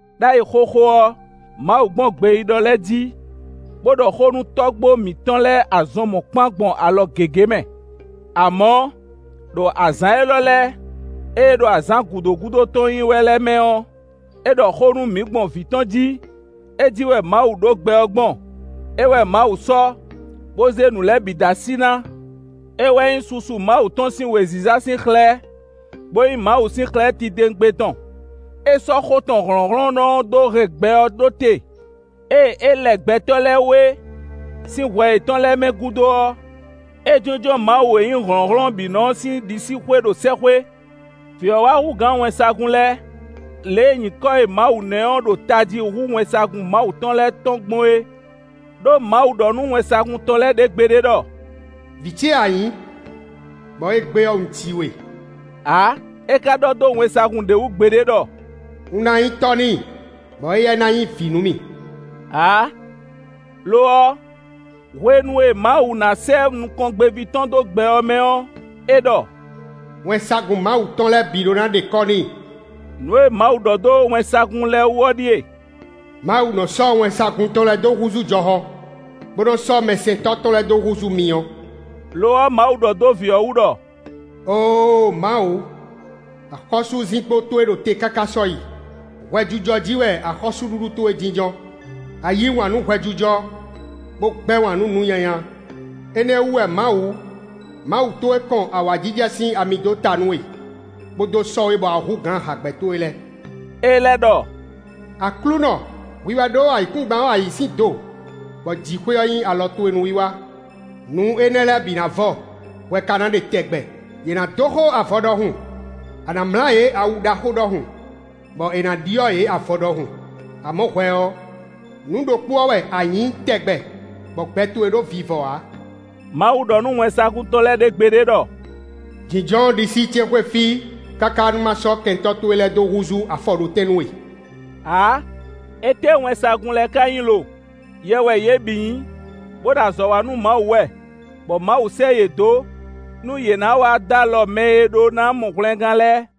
Đ'ayǐ xóxó ɔ́, Mawu gbɔn gbeyíɖɔ lɛ́ɛ jí, bó ɖɔ xó nú tɔ́gbó mǐtɔn lɛ́ɛ azɔn mɔ̌kpán gbɔn alɔ gěgé mɛ. Amɔ̌, ɖo azǎn élɔ́ lɛ́ɛ, éé ɖo azǎn gǔdo gúdo tɔn nyí wɛ lɛ́ɛ mɛ ɔ́, é ɖɔ xó nú mǐ gbɔn vǐ tɔn jí; é jí wɛ Mawu ɖó gbɛ ɔ́ gbɔn; é wɛ Mawu sɔ́, bó zé nǔ lɛ́ɛ bǐ dó así ná. É wɛ nyí susu Mawu tɔn sín wěziza sín xlɛ́, bó nyí Mawu sín xlɛ́ titewungbe tɔn. É sɔ́ xó tɔn hlɔ̌nhlɔ́nnɔ ɔ́ dó hɛn gbɛ ɔ́ ɖó te. Ée é lɛ gbɛtɔ́ lɛ́ɛ wé sín hwɛ yětɔn lɛ́ɛ mɛ gúdo ɔ́, é jínjɔ́n Mawu e nyí hlɔ̌nhlɔ́n bǐ nɔ ɔ́ sín ɖisíxwé ɖo sɛ́xwé. Vǐ ɔ́ wá hú gǎn wɛnsagun lɛ́ɛ lě e nyǐkɔ e Mawu ná ɛ ɔ́ ɖo tají hú wɛnsagun Mawu tɔn lɛ́ɛ tɔn gbɔn é. Đó Mawu ɖɔ nú wɛnsagun tɔn lɛ́ɛ ɖě gbeɖé ɖɔ: “Vǐ ce wɛ a nyǐ, bɔ égbé ɔ́, un ji we” ǎ. É ka ɖɔ dó wɛnsagun ɖé wú gbeɖé ɖɔ: “Un ná nyí tɔ́ n'i, bɔ éyɛ́ ná nyí vǐ nú mì” ǎ. Lo ɔ́, hwenu e Mawu ná sɛ́ nukɔngbéví tɔn dó gbɛ ɔ́ mɛ ɔ́, é ɖɔ: “Wɛnsagun Mawu tɔn lɛ́ɛ bǐ ɖó ná ɖe kɔ́ n'i.” Nǔ e Mawu ɖɔ dó wɛnsagun lɛ́ɛ wú ɔ́ ɖíe: “Mawu nɔ sɔ́ wɛnsagun tɔn lɛ́ɛ dó húzú jɔhɔn, bó nɔ́ sɔ́ mɛsɛntɔ́ tɔn lɛ́ɛ dó húzú myɔ.” Lo ɔ́, Mawu ɖɔ dó vǐ ɔ́ wú ɖɔ: “Óo! Mawu, axɔ́súzinkpo towe ɖo te káká sɔ́yi. Hwɛjijɔ jí wɛ axɔ́súɖuɖu towe jínjɔ́n. A yǐ wǎn nú hwɛjijɔ, bó gbɛ́ wǎn nú nǔ nyanya; énɛ́ ɔ́ wú wɛ Mawu, Mawu towe kɔn awǎjijɛ sín ami dó ta nú we, bó dó sɔ́ we bɔ a hú gǎn hǎgbɛ́ towe lɛ́ɛ.” É lɛ́ ɖɔ: “Aklúnɔ, hwi wɛ ɖó ayǐkúngban ɔ́ ayǐ sín do, bɔ jǐxwé ɔ́ nyí alɔ towe núwiwa. Nǔ énɛ́ lɛ́ɛ bǐ ná vɔ; hwɛ ka ná ɖe tɛgbɛ; yě ná dóxó avɔ ɖɔhun. A nǎ mlá yě awu ɖaxó ɖɔhun, bɔ è nǎ ɖyɔ́ yě avɔ ɖɔhun. Amɔ̌ hwɛ ɔ́, nǔ ɖokpó ɔ́ wɛ a nyǐ tɛgbɛ, bɔ gbɛ towe ɖó vivɔ ǎ.” Mawu ɖɔ nú wɛnsagun tɔn lɛ́ɛ ɖě gbeɖé ɖɔ: “Jǐnjɔ́n ɖisí ce xwé fí káká nú ma sɔ́ kɛntɔ́ towe lɛ́ɛ dó húzú afɔɖótɛn nú we” ǎ. Étɛ́ wɛnsagun lɛ́ɛ ka nyí lo? Yɛ wɛ yě bǐ nyí, bó ɖo azɔ̌ wa nú Mawu wɛ, bɔ Mawu sɛ́ yě dó nú yě ná wá dó alɔ mɛ e ɖó ná mɔ hwlɛngán lɛ́ɛ.